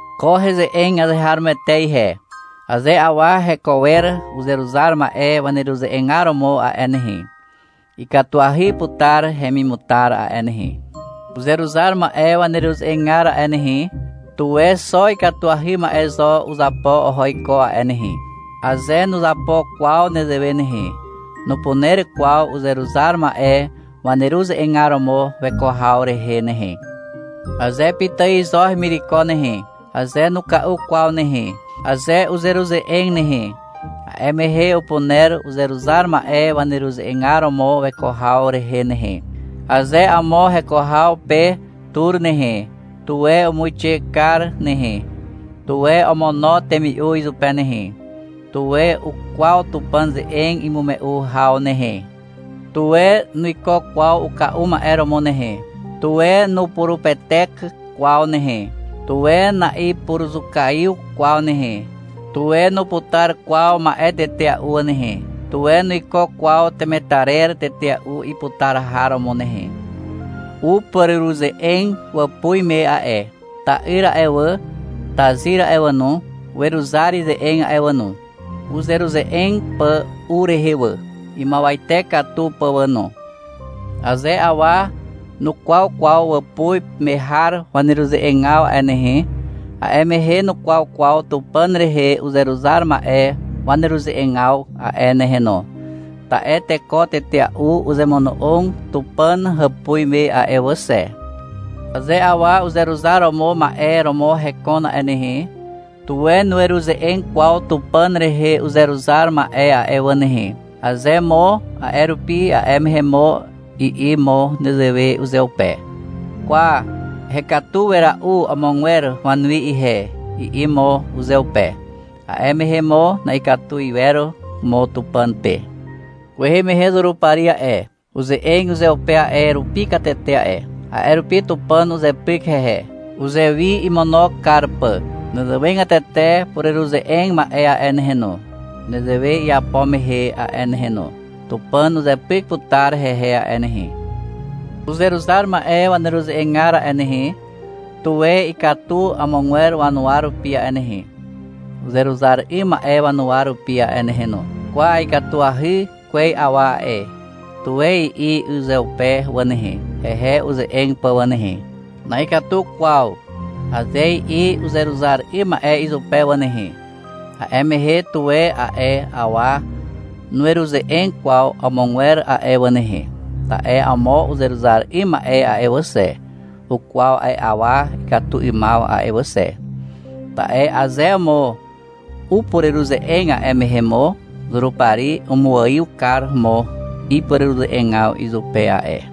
Ko heze'eg azeharomoete ihe. Aze awa heko wer uzeruzar ma'e waneruze'egar romo a'e nehe, ikatuahy putar hemimutar a'e nehe. Uzeruzar ma'e waneruze'egar a'e nehe, tuwe xo ikatuahy ma'e zo uzapo oho iko a'e nehe. Aze nuzapo kwaw nezewe nehe, nupuner kwaw uzeruzar ma'e waneruze'egar romo weko haw rehe nehe. Aze pitài zo hemireko nehe, aze nuka'u kwaw nehe, aze uzeruze'eg nehe, a'e mehe upuner uzeruzar ma'e waneruze'egar romo weko haw rehe nehe. Aze amo heko haw pe tur nehe, tuwe umuixe kar nehe, tuwe omono temi'u izupe nehe. Tuwe ukwaw Tupàn ze'eg imume'u haw nehe. Tuwe nuiko kwaw uka'u ma'e romo nehe. Tuwe nupurupetek kwaw nehe. Tuwe na'ipuruzukaiw kwaw nehe. Tuwe nuputar kwaw ma'e tetea'u nehe. Tuwe nuiko kwaw temetarer tetea'u iputar har romo nehe. Upureruze'eg wàpuz me a'e. Ta'yr a'e wà, tazyr a'e wà no, weruzar ize'eg a'e wà no, uzeruze'eg pà u rehe wà, imuawate katu pà wà no. Aze awa nukwaw kwaw wàpuz me har waneruze'egaw a'e nehe, a'e mehe nukwaw kwaw Tupàn rehe uzeruzar ma'e waneruze'egaw a'e nehe no, ta'e teko tetea'u uzemono'og Tupàn hàpuz me a'e wà xe. Aze awa uzeruzar romo ma'e romo hekon a'e nehe, tuwe nueruze'eg kwaw Tupàn rehe uzeruzar ma'e a'e wà nehe. Aze mo a'e rupi, a'e mehe mo i'i mo nezewe uzeupe. — Kwa, hekatu wera'u amogwer wanuwi ihe, i'i mo uzeupe. A'e mehe mo na'ikatu iwer mo Tupàn pe. Kwehe mehe Zurupari a'e, uze'eg uzeupe a'e rupi katete a'e. A'e rupi Tupàn uzepyk hehe, uzewi imono kar pà. Nezewegatete pureruze'eg ma'e a'e nehe no, nezewe iapo mehe a'e nehe no. Tupàn uzepyk putar hehe a'e nehe. Uzeruzar ma'e waneruze'egar a'e nehe, tuwe ikatu amogwer wanuwa rupi a'e nehe, uzeruzar 'ym ma'e wanuwa rupi a'e nehe no. — Kwa, ikatuahy kwez awa a'e, tuwe i'i uzeupe wà nehe, hehe uze'eg pà wà nehe. — Na'ikatu kwaw, aze i'i uzeruzar 'ym ma'e izupe wà nehe, a'e mehe, tuwe a'e awa nueruze'eg kwaw amogwer a'e wà nehe. Ta'e amo uzeruzar 'ym ma'e a'e wà xe, ukwaw a'e awa ikatu 'ymaw a'e wà xe. Ta'e aze mo upureruze'eg, a'e mehe mo Zurupari umuaiw kar mo ipureruze'egaw izupe a'e.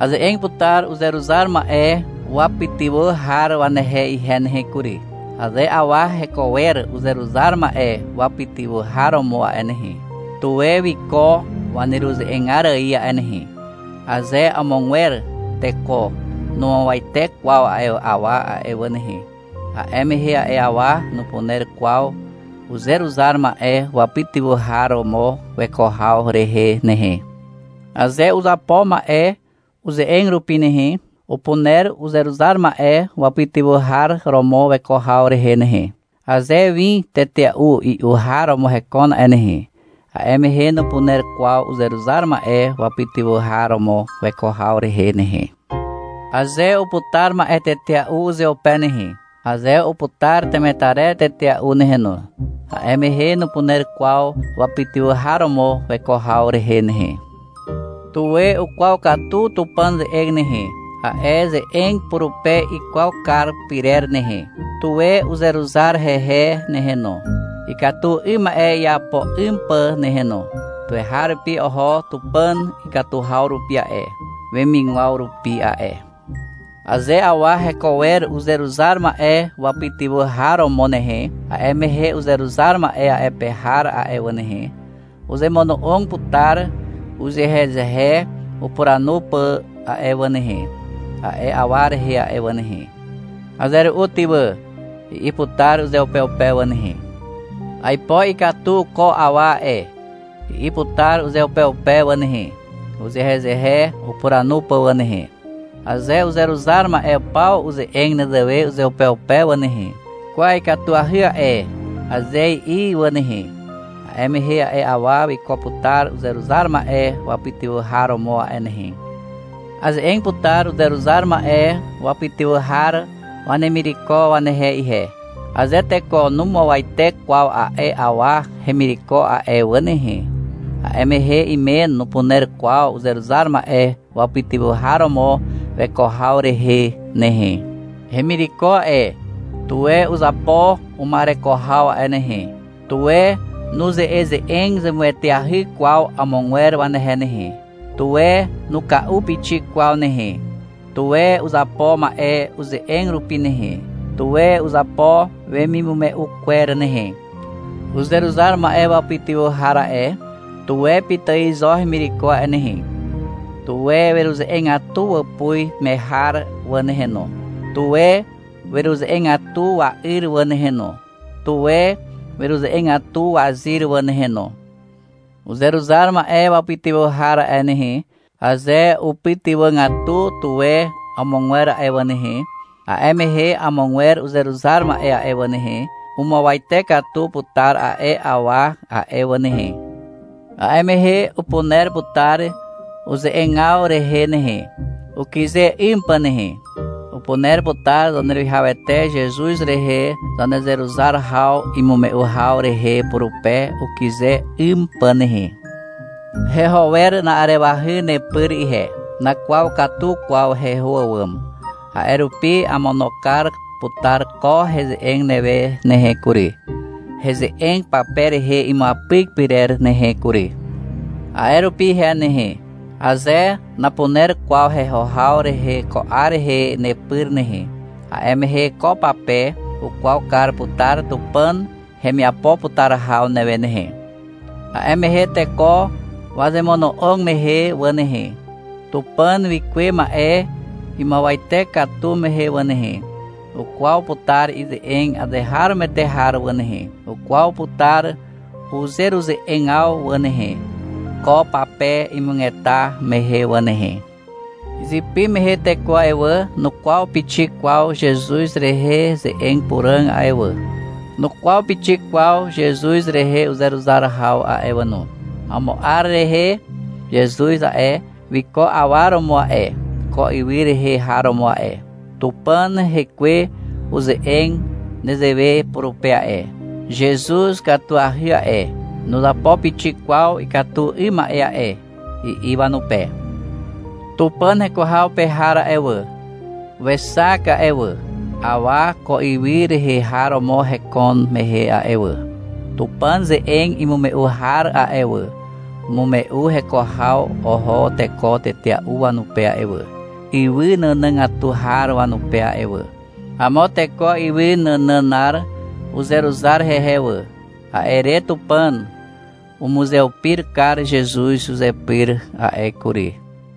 Aze'eg putar uzeruzar ma'e wapytywà har wanehe ihe nehe kury. Aze awa heko wer uzeruzar ma'e wapytywà har romo a'e nehe, tuwe wiko waneruze'egar ài a'e nehe. Aze amogwer teko numuawate kwaw a'e awa a'e wà nehe, a'e mehe a'e awa nupuner kwaw uzeruzar ma'e wapytywà har romo weko haw rehe nehe. Aze uzapo ma'e uze'eg rupi nehe, upuner uzeruzar ma'e wapytywà har romo weko haw rehe nehe. Aze win tetea'u i'u har romo hekon nehe, a'e mehe nupuner kwaw uzeruzar ma'e wapytywà har romo weko haw rehe nehe. Aze uputar ma'e tetea'u uzeupe nehe, aze uputar temetarer tetea'u nehe no, a'e mehe nupuner kwaw wapytywà har romo weko haw rehe nehe. Tuwe ukwaw katu Tupàn ze'eg nehe, a'e ze'eg purupe ikwaw kar pyrer nehe. Tuwe uzeruzar hehe nehe no, ikatu 'ym ma'e iapo 'ym pà nehe no. Tuweharupi oho Tupàn ikatu haw rupi a'e, wemigwaw rupi a'e. Aze awa heko wer uzeruzar ma'e wapytywà har romo nehe, a'e mehe uzeruzar ma'e a'e pe har a'e wà nehe, uzemono'og putar uzehezehe upuranu pà a'e wà nehe, a'e awa rehe a'e wà nehe. — Aze ru'u ty wà, i'i putar uzeupeupe wà nehe. — Aipo ikatu ko awa a'e, i'i putar uzeupeupe wà nehe, uzehezehe upuranu pà wà nehe. Aze uzeruzar ma'e paw uze'eg nezewe uzeupeupe wà nehe, — Kwa ikatuahy a'e, aze i'i wà nehe, a'e mehe a'e awa wiko putar uzeruzar ma'e wapytywà har romo a'e nehe. Aze'eg putar uzeruzar ma'e wapytywà har wanemireko wanehe ihe. Aze teko numuawate kwaw a'e awa hemireko a'e wà nehe, a'e mehe imen nupuner kwaw uzeruzar ma'e wapytywà har romo weko haw rehe nehe. Hemireko a'e, tuwe uzapo uma'ereko haw a'e nehe. Tuwe nuze'eze'eg zemueteahy kwaw amogwer wanehe nehe. Tuwe nuka'u pixik kwaw nehe. Tuwe uzapo ma'e uze'eg rupi nehe, tuwe uzapo wemimume'u kwer nehe. Uzeruzar ma'e wapytywà har a'e, tuwe pitài zo hemireko a'e nehe. Tuwe weruze'egatu wàpuz me har wà nehe no, tuwe weruze'egatu wa'yr wà nehe no, tuwe weruze'egatu wazyr wà nehe no. Uzeruzar ma'e wapytywà har a'e nehe, aze upytywàgatu tuwe amogwer a'e wà nehe, a'e mehe amogwer uzeruzar ma'e a'e wà nehe, umuawate katu putar a'e awa a'e wà nehe. A'e mehe upuner putar uze'egaw rehe nehe, ukyze 'ym pà nehe. Upuner putar Zaneruwihawete Zezuz rehe zanezeruzar haw imume'u haw rehe purupe ukyze 'ym pà nehe. Heho wer na'arewahy nepyr ihe. Nakwaw katu kwaw heho àwàm, a'e rupi amono kar putar ko heze'eg newe nehe kury, heze'eg pape rehe imuapyk pyrer nehe kury. A'e rupi ihe nehe, aze napuner kwaw heho haw rehe ko 'ar rehe nepyr nehe, a'e mehe ko pape ukwaw kar putar Tupàn hemiapo putar haw newe nehe. A'e mehe teko wazemono'og mehe wà nehe, Tupàn wikuwe ma'e imuawate katu mehe wà nehe, ukwaw putar ize'eg azeharomoete har wà nehe. Ukwaw putar uzeruze'egaw wà nehe, ko pape imugeta mehe wà nehe. Izypy mehe teko a'e wà, nukwaw pixik kwaw Zezuz rehe ze'eg puràg a'e wà, nukwaw pixik kwaw Zezuz rehe uzeruzar haw a'e wà no. Amo 'ar rehe Zezuz a'e, wiko awa romo a'e, ko ywy rehe har romo a'e. Tupàn Hekwe uze'eg nezewe purupe a'e, — Zezuz ikatuahy a'e, nuzapo pixik kwaw ikatu 'ym ma'e a'e, i'i wanupe. Tupàn heko haw pe har a'e wà, wexak a'e wà, awa ko ywy rehe har romo heko mehe a'e wà. Tupàn ze'eg imume'u har a'e wà, umume'u heko haw oho teko tetea'u wanupe a'e wà, ywy nànàgatu har wanupe a'e wà. Amo teko ywy nànànar uzeruzar hehe wà. A'e re Tupàn umuzeupir kar Zezuz uzepyr a'e kury.